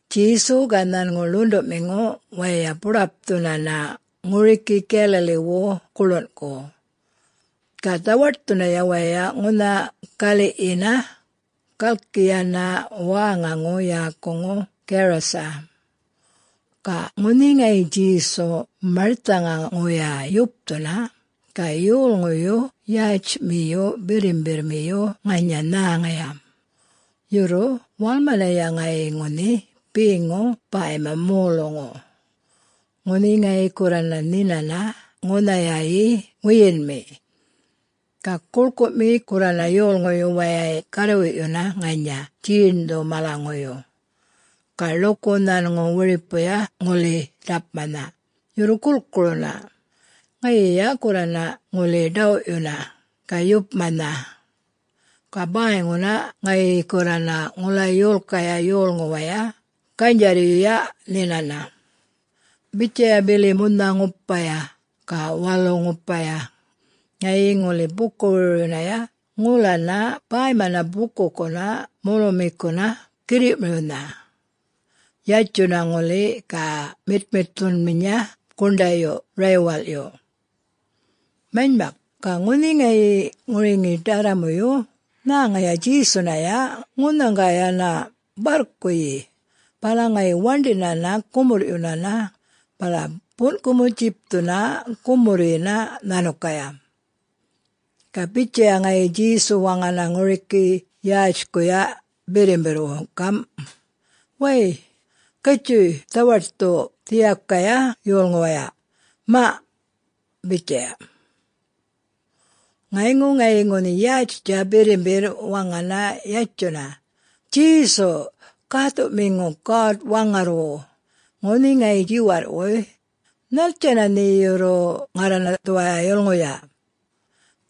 Djesu ga nhanŋu ḻuṉḏuꞌmiŋu waya buḏapthunana ŋuriki Galilee-wu guḻunꞌku, ga dhawaṯthunaya waya ŋunha galiꞌyina galki yana wäŋaŋu yäkuŋu Garasa. Ga ŋunhi ŋayi Djesu marthaŋaŋuya yupthuna ga yolŋuyu yätjmiyu birrimbirrmiyu ŋanya nhäŋaya, yurru walmanaya ŋayi ŋunhi beŋu bäyma moluŋu, ŋunhi ŋayi gurrana nhinana ŋunhayayi wiyinŋumi. Ga guḻkuꞌmi gurrana yolŋuyu wayay garrwiꞌyuna ŋanya djeṉdhu malanyŋuyu, ga ḻuku nhanŋu wiripuya ŋuli ḏapmanha, yurru gulkuruna, ŋayiya gurrana ŋuli ḏawꞌyuna, ga yupmanha. Ga bäyŋuna ŋayi gurrana ŋula yolkaya yolŋuwaya ganydjarryuya nhinana. Bitjaya bili munha-ŋupaya ga walu-ŋupaya ŋayi ŋuli buku-wirwiryunaya ŋulana bäymana bukukuna molumikuna girriꞌmiriwnha, yatjuna ŋuli ga miṯmiṯthunminya guṉḏayu raywalꞌyu. Manymak, ga ŋunhi ŋayi ŋuriŋi ḏarramuyu nhäŋaya Djesunaya ŋunhaŋga yana barrkuyi bala yana waṉḏinana gumurrꞌyunana bala bunꞌkumu-djipthuna gumurryina nhanukaya. Ga bitjaya ŋayi Djesu waŋana ŋuriki yätjkuya birrimbirrwu gamꞌ, “Way! Gatjuy dhawaṯthu dhiyakaya yolŋuwaya, maꞌ,” bitjaya. Ŋayŋu ŋayi ŋunhi yätjtja birrimbirr waŋana yatjunana, “Djesu! Gäthuꞌmiŋu God-Waŋarrwu, ŋunhi ŋayi djiwarrꞌwuy, nhattjana nhe yurru ŋarrana dhuwaya yulŋuya?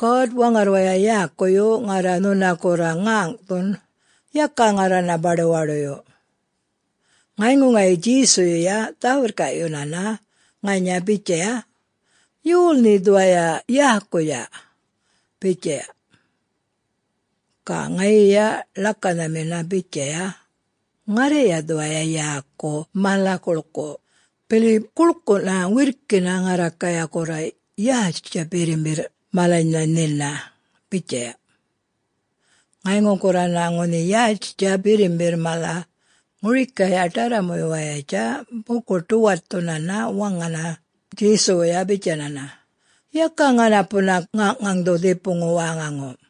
God-Waŋarrwaya yäkuyu ŋarra nhuna gurra ŋäŋꞌthun, yaka ŋarrana baḏuwaḏuyu.” Ŋayŋu ŋayi Djesuyuya dhä-wirrkaꞌyunana ŋanya bitjaya, “Yol nhe dhuwaya yäkuya?” bitjaya. Ga ŋayiya ḻakanhamina bitjaya, “Ŋarraya dhuwaya yäku Mala-Guḻkuꞌ, bili guḻkuꞌna wirrkina ŋarrakaya gurra yätjtja birrimbirr malanynha nhina,” bitjaya. Ŋayŋu gurrana ŋunhi yätjtja birrimbirr mala ŋurikaya ḏarramuwayatja buku-ḏuwaṯthunana waŋana Djesuwuya bitjayana, “Yaka ŋanapuna ŋaŋꞌŋaŋdhu dhipuŋu wäŋaŋu!”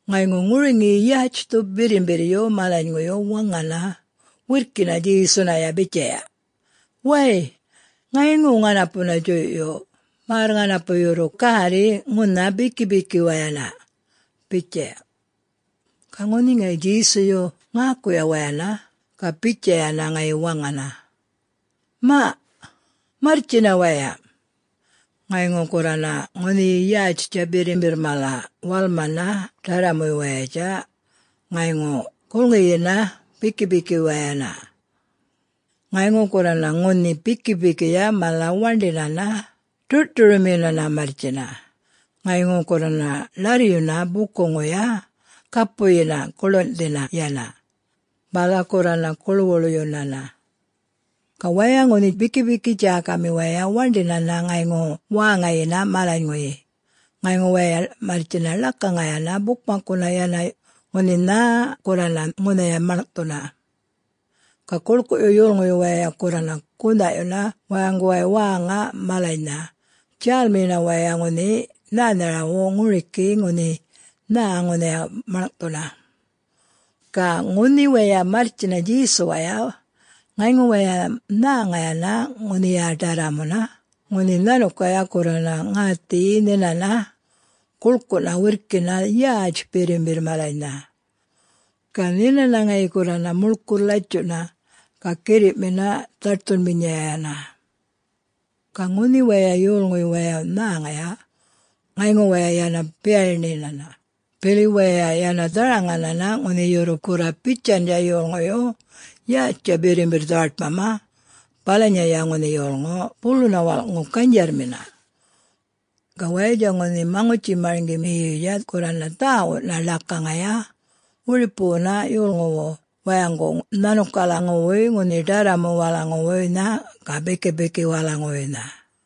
Ŋayŋu ŋuriŋiya yätjthuya birrimbirryu malanyŋuyu waŋana wirrkina Djesunaya bitjaya, “Wäy, ŋayŋuna ŋanapuna djuyꞌyu, märr ŋanapu yurru gärri ŋunha bikipikiwayana,” bitjaya. Ga ŋunhi ŋayi Djesuyu ŋäkuya wayana ga bitjayana ŋayi waŋana, “Maꞌ... marrtjina waya!” Ŋayŋu gurrana ŋunhi yätjtja birrimbirr mala walmana ḏarramuwayatja ŋayŋu gulŋiyina bikipikiwayana. Ŋayŋu gurrana ŋunhi bikipikiya mala waṉḏinana, ḏurꞌṯuryunmina marrtjina, ŋayŋu gurrana ḻarryuna bukuŋuya, gapuyina guḻunꞌthina yana, bala gurrana guḻwuḻyunana. Ga waya ŋunhi bikipiki djäkami waya waṉḏina ŋayŋu wäŋayina malaŋuyi, ŋayŋu waya marrtjina ḻakaŋayana bukmakkuna yana ŋunhi nhä gurrana ŋunhaya maḻŋꞌthuna. Ga guḻkuꞌyu yolŋuyu wayay gurrana gunhaꞌyuna wayaŋgu wäŋa malanynha, djälmiyina waya ŋunhi nhänharaw ŋuriki ŋunhi nhä ŋunhaya maḻŋꞌthuna. Ga ŋunhi waya marrtjina Djesuwaya, ŋayŋu waya nhäŋayana ŋunhiya ḏarramuna ŋunhi nhanukaya gurrana ŋäthiyi nhinana guḻkuꞌna wirrkina yätj birrimbirr malanynha. Ga nhinana ŋayi gurrana muḻkurr latjuꞌna ga girriꞌmina dhaṯthunminyayana. Ga ŋunhi waya yolŋuyu wayay nhäŋaya, ŋayŋu waya yana biyaṉiyinana, bili waya yana dharaŋayana ŋunhi yurru gurra bitjandja yolŋuyu yätjtja birrimbirr dhawaṯmama balanyaya ŋunhi yolŋu buluna walꞌŋu ganydjarrmi. Ga wayatja ŋunhi maŋutji-marŋgimiyuya gurrana dhäwuꞌna ḻakaŋaya wiripuwuna yolŋuwu wayaŋgu nhanukalaŋuwuy ŋunhi ḏarramuwalaŋuwuynha ga bikipikiwalaŋuwuynha.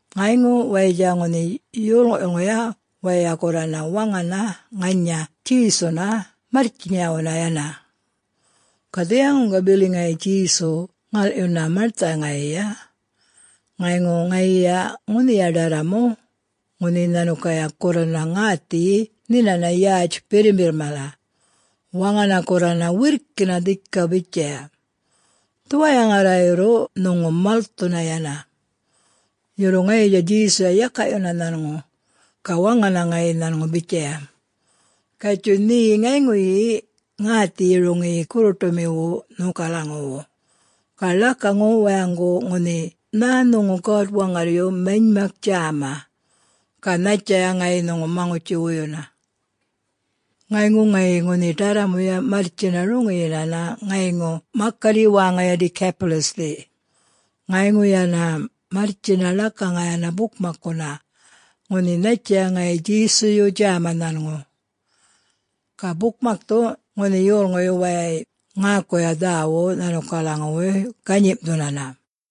Ŋayŋu wayatja ŋunhi yolŋuyuya wayay gurrana waŋana ŋanya Djesuna marrtjinyawuna yana. Ga dhiyaŋuŋga bili ŋayi Djesu ŋalꞌyuna marthaŋayiya, ŋayŋu ŋayiya ŋunhiya ḏarramu ŋunhi nhanukaya gurrana ŋäthiyi nhinana yätj birrimbirr mala, waŋana gurrana wirrkina dhika bitjaya, “Dhuwaya ŋarra yurru nhuŋu malthuna yana!” Yurru ŋayiya Djesuya yakaꞌyuna nhanŋu, ga waŋana ŋayi nhanŋu bitjaya, “Gatjuy nhe ŋayŋuyi ŋäthiyi roŋiyi gurruṯumiwu nhokalaŋuwu, ga ḻakaŋu wayaŋgu ŋunhi nhä nhuŋu God-Waŋarryu manymak djäma ga nhattjaya ŋayi nhuŋu maŋutji-wuyuna.” Ŋayŋu ŋayi ŋunhi ḏarramuya marrtjina roŋiyinana ŋayŋu makarryi wäŋayi Decapolis-thi, ŋayŋu yana marrtjina ḻakaŋayana bukmakkuna, ŋunhi nhattjaya ŋayi Djesuyu djäma nhanŋu. Ga bukmakthu ŋunhi yolŋuyu wayay ŋäkuya dhäwuꞌ nhanukalaŋuwuy ganyimꞌthunana.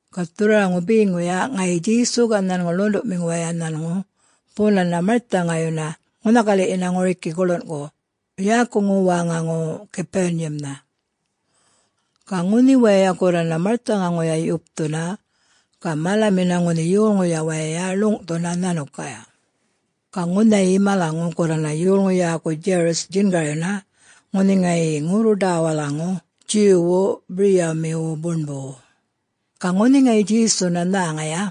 Ga dhurrwaraŋu beŋuya ŋayi Djesu ga ḻunḏuꞌmiŋu waya nhanŋu bunana marthaŋayuna ŋunha galiꞌyina ŋuriki guḻunꞌku, yäkuŋu wäŋaŋu Capernaum-nha. Ga ŋunhi waya gurrana marthaŋaŋuya yupthuna, ga malamina ŋunhi yolŋuya waya ḻuŋꞌthuna nhanukaya. Ga ŋunhayayi malaŋu gurrana yolŋu yäku Jairus djingaryuna ŋunhi ŋayi ŋurru-ḏawalaŋu Jew-wu biryamiwu buṉbuwu. Ga ŋunhi ŋayi Djesunaya nhäŋaya,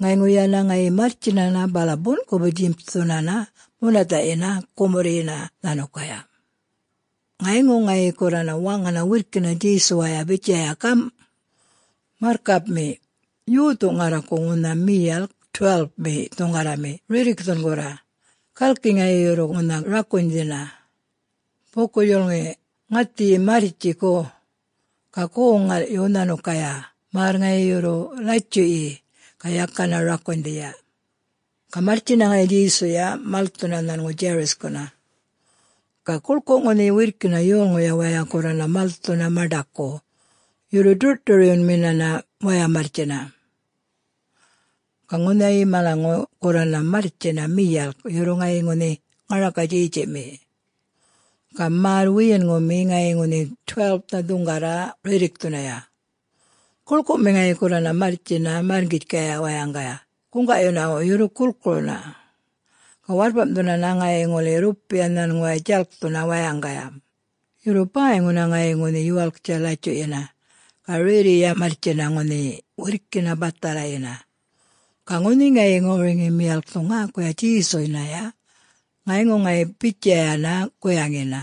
ŋayŋu yana ŋayi marrtjinana bala bunꞌkumu-djipthunana munathaꞌyina gumurryina nhanukaya. Ŋayŋu ŋayi gurrana waŋana wirrkina Djesuwayana bitjaya gamꞌ, “Marrkapmi! Yothu ŋarraku ŋunha miyalk 12-mi dhuŋgarrami rirrikthun gurra, galki ŋayi yurru ŋunha rakunydhina! Buku-djulŋi, ŋäthiyi marrtji go, ga goŋ-ŋalꞌyu nhanukaya märr ŋayi yurru latjuꞌyi, ga yakana rakunydhiya.” Ga marrtjina ŋayi Djesuya malthuna nhanŋu Jairus-kuna. Ga guḻkuꞌ ŋunhi wirrkina yolŋuya waya gurrana malthuna maṉḏaku yurru ḏurꞌṯuryunminana waya marrtjina. Ga ŋunhayayi malaŋu gurrana marrtjina miyalk, yurru ŋayi ŋunhi ŋaraka-djetjiꞌmi. Ga märr wiyinŋumi ŋayi ŋunhi 12-nha dhuŋgarra rirrikthunaya. Guḻkuꞌmi ŋayi gurrana marrtjina marrŋgitjkaya wayaŋgaya guŋgaꞌyunawu yurru gulkuruna. Ga warrpamꞌthunana ŋayi ŋuli rrupiya nhanŋuway djalkthuna wayaŋgaya, yurru bäyŋuna ŋayi ŋunhi yuwalktja latjuꞌyina, ga rerriya marrtjina ŋunhi wirrkina bathalayina. Ga ŋunhi ŋayi ŋuriŋi miyalkthu ŋäkuya Djesunaya, ŋayŋu ŋayi bitjayana guyaŋina,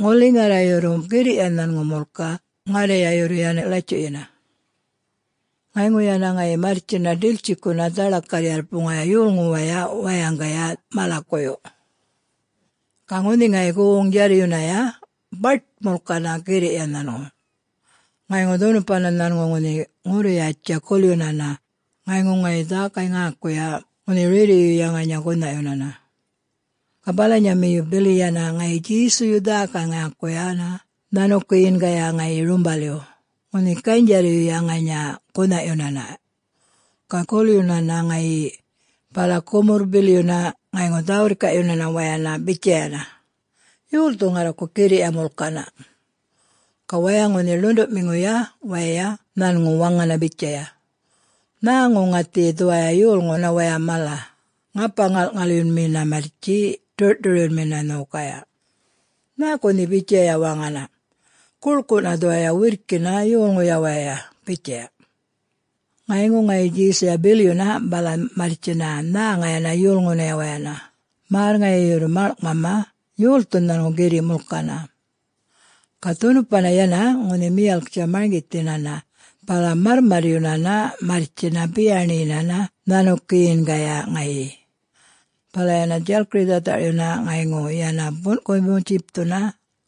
“Ŋuli ŋarra yurru girriꞌya nhanŋu mulka ŋarraya yurru yana latjuꞌyina.” Ŋayŋu yana ŋayi marrtjina ḏiltjikuna dhaḻakarr-yarpuŋaya yolŋuwaya wayaŋgaya malakuyu. Ga ŋunhi ŋayi goŋ-djarryunaya baṯnha mulkana girriꞌya nhanŋu. Ŋayŋu dhunupana nhanŋu ŋunhi ŋurru-yätjtja gulyunana, ŋayŋu ŋayi dhäkay-ŋäkuya ŋunhi rerriꞌyuya ŋanya gunhaꞌyunana. Ga balanyamiyu bili yana ŋayi Djesuyuya dhäkay-ŋäkuyana nhanukiyingaya ŋayi rumbalyu, ŋunhi ganydjarryuya ŋanya gunhaꞌyunana. Ga gulyunana ŋayi, bala gumurr-bilyuna ŋayŋu dhä-wirrkaꞌyunana wayana bitjayana, “Yolthu ŋarraku girriꞌya mulkana?” Ga waya ŋunhi ḻuṉḏuꞌmiŋuya waya nhanŋu waŋana bitjaya, “Nhäŋu ŋäthiyi dhuwaya yolŋuna waya mala, ŋapa-ŋalꞌŋalyunmina marrtji ḏurꞌ-ṯuryunmina nhokaya. Nhäku nhe bitjayatja waŋana, guḻkuꞌna dhuwaya wirrkina yolŋuya waya,” bitjaya. Ŋayŋu ŋayi Djesuya bilyunana bala marrtjina nhäŋayana yolŋunaya wayana, märr ŋayi yurru maḻŋꞌmama yolthu nhanŋu girriꞌ mulkana. Ga dhunupana yana ŋunhi miyalktja marŋgithinana bala marrmarryunana marrtjina biyaṉiyuna nhanukiyingaya ŋayi, bala yana djalkiri-dhatharꞌyuna ŋayŋu yana bunꞌkumu-djipthuna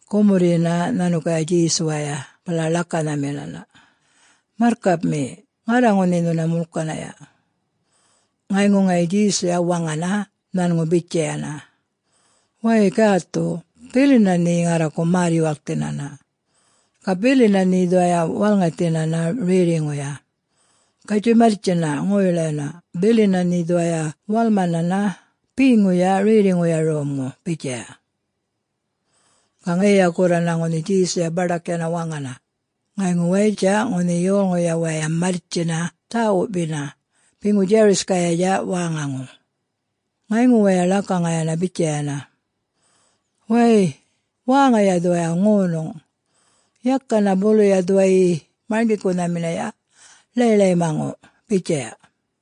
gumurryina nhanukaya Djesuwaya bala ḻakanhamina, “Marrkapmi, ŋarra ŋunhi nhuna mulkanaya.” Ŋayŋu ŋayi Djesuya waŋana nhanŋu bitjayana, “Wäy... gäthu, bilina nhe ŋarraku märr-yuwalkthinana, ga bilina nhe dhuwaya walŋathinana rerriŋuya. Gatjuy marrtjina ŋoy-layuna bilina nhe dhuwaya walmanana beŋuya rerriꞌŋuya romŋu,” bitjaya. Ga ŋayiya gurrana ŋunhi Djesuya baḏak yana waŋana, ŋayŋu wayatja ŋunhi yolŋuya waya marrtjina dhäwuꞌmiya beŋu Jairus-kayatja wäŋaŋu, ŋayŋu waya ḻakaŋayana bitjayana, “Wäy... wäŋaya dhuwaya ŋonuŋ. Yakana buluya dhuwayi Marŋgikunhaminaya ḻayḻaymaŋu,” bitjaya.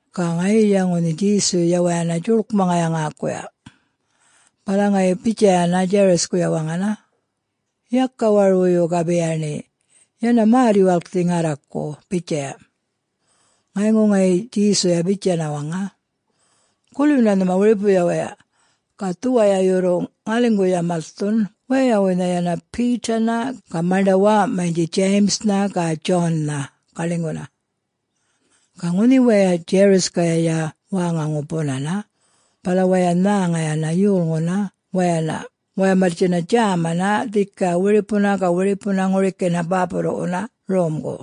Ga ŋayiya ŋunhi Djesuyuya wayana djuḻkmaŋaya ŋäkuya, bala ŋayi bitjayana Jairus-kuya waŋana, “Yaka warwuyu ga biyaṉi, yana märr-yuwalkthi ŋarraku,” bitjaya. Ŋayŋu ŋayi Djesuya bitjana waŋa, “Gulyuna nhuma wiripuya waya ga dhuwaya yurru ŋaliŋguya malthun wayawuynha yana Peter-na ga maṉḏana wäwaꞌmanydji James-nha ga John-nha ga ḻinyguna.” Ga ŋunhi waya Jairus-kaya wäŋaŋu bunana bala waya nhäŋayana yolŋuna wayana waya marrtjina djämana dhika wiripuna ga wiripuna ŋurikina bäpurruꞌwuna romgu.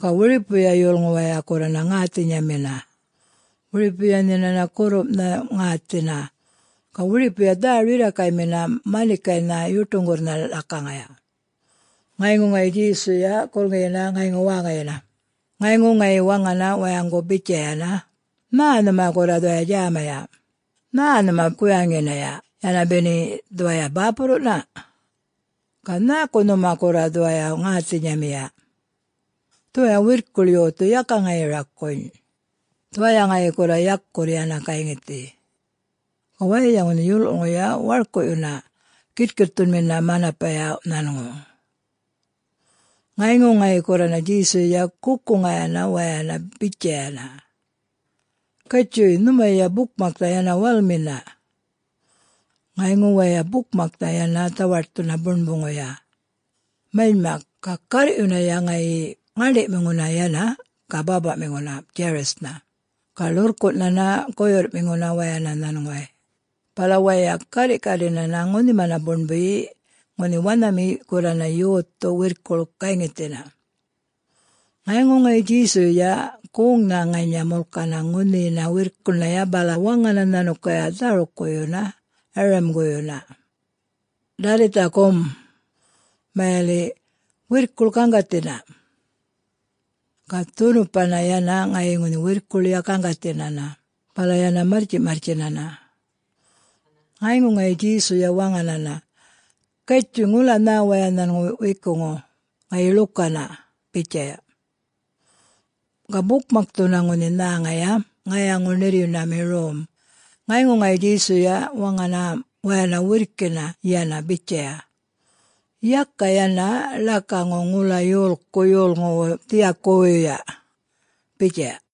Ga wiripuya yolŋu waya gurrana ŋäthinyamina, wiripuya nhinana gurrumꞌnha ŋäthina ga wiripuya dhä-rirrakaymina manikaynha yuṯuŋgurrnha ḻakaŋaya. Ŋayŋu ŋayi Djesuya gulŋiyina ŋayŋu wäŋayina, ŋayŋu ŋayi waŋana wayaŋgu bitjayana, “Nhä nhuma gurra dhuwaya djämaya, nhä nhuma guyaŋinaya yana beni dhuwaya bäpurruꞌna? Ga nhäku nhuma gurra dhuwaya ŋäthinyamiya? Dhuwaya wirrkuḻ yothu yaka ŋayi rakuny, dhuwaya ŋayi gurra yakurr yana gayŋithi.” Ga wayatja ŋunhi yolŋuꞌ-yulŋuyuya warkuꞌyuna, gitkitthunmina manapaya nhanŋu. Ŋayŋu ŋayi gurrana Djesuyuya gukuŋayana wayana bitjayana, “Gatjuy nhumaya bukmaknha yana walmina.” Ŋayŋu waya bukmaknha yana dhawaṯthuna buṉbuŋuya. Manymak, ga garrꞌyunaya ŋayi ŋäṉḏiꞌmiŋuna yana ga bäpaꞌmiŋuna Jairus-nha ga ḻurrkunꞌnhana guyurrꞌmiŋuna wayana nhanŋuway, bala waya garriꞌkarrina ŋunhima buṉbuyina ŋunhi wanhami gurrana yothu wirrkuḻ gayŋithina. Ŋayŋu ŋayi Djesuyuya goŋnha ŋanya mulkana ŋunhina wirrkuḻnhaya bala waŋana nhanukaya dhärukkuyuna Arram-guyuna, “Dalitha gom!” (Mayaliꞌ “Wirrkuḻ gaŋgathina!”) Ga dhunupana yana ŋayi ŋunhi wirrkuḻya gaŋgathinana, bala yana marrtjiꞌmarrtjinana. Ŋayŋu ŋayi Djesuya waŋanana, “Gatjuy ŋula nhä waya nhanŋu wekuŋu ŋayi ḻukana,” bitjaya. Ga bukmakthuna ŋunhi nhäŋaya ŋayaŋu-ṉirryunami rom, ŋayŋu ŋayi Djesuya waŋana wayana wirrkina yana bitjaya, “Yaka yana ḻakaŋu ŋula yolku yolŋuwu dhiyakuwuyya,” bitjaya.